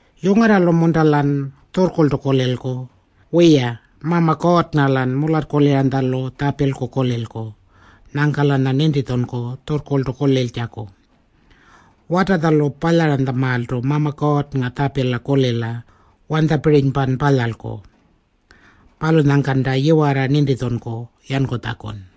Yungarralu-munta-lan tjurrkurltu kulilku? Wiya, Mama Kuurrnga-lan mularrkuliranytjalu tjapilku kulilku. Nyangka-lanya nintitjunku tjurrkurltu kuliltjaku. Watatjalu palyaranytjamaaltu Mama Kuurrnga tjapila kulila wanytjapirinypan palyalku. Palunyangkanta yiwarra nintitjunku yankutjakun.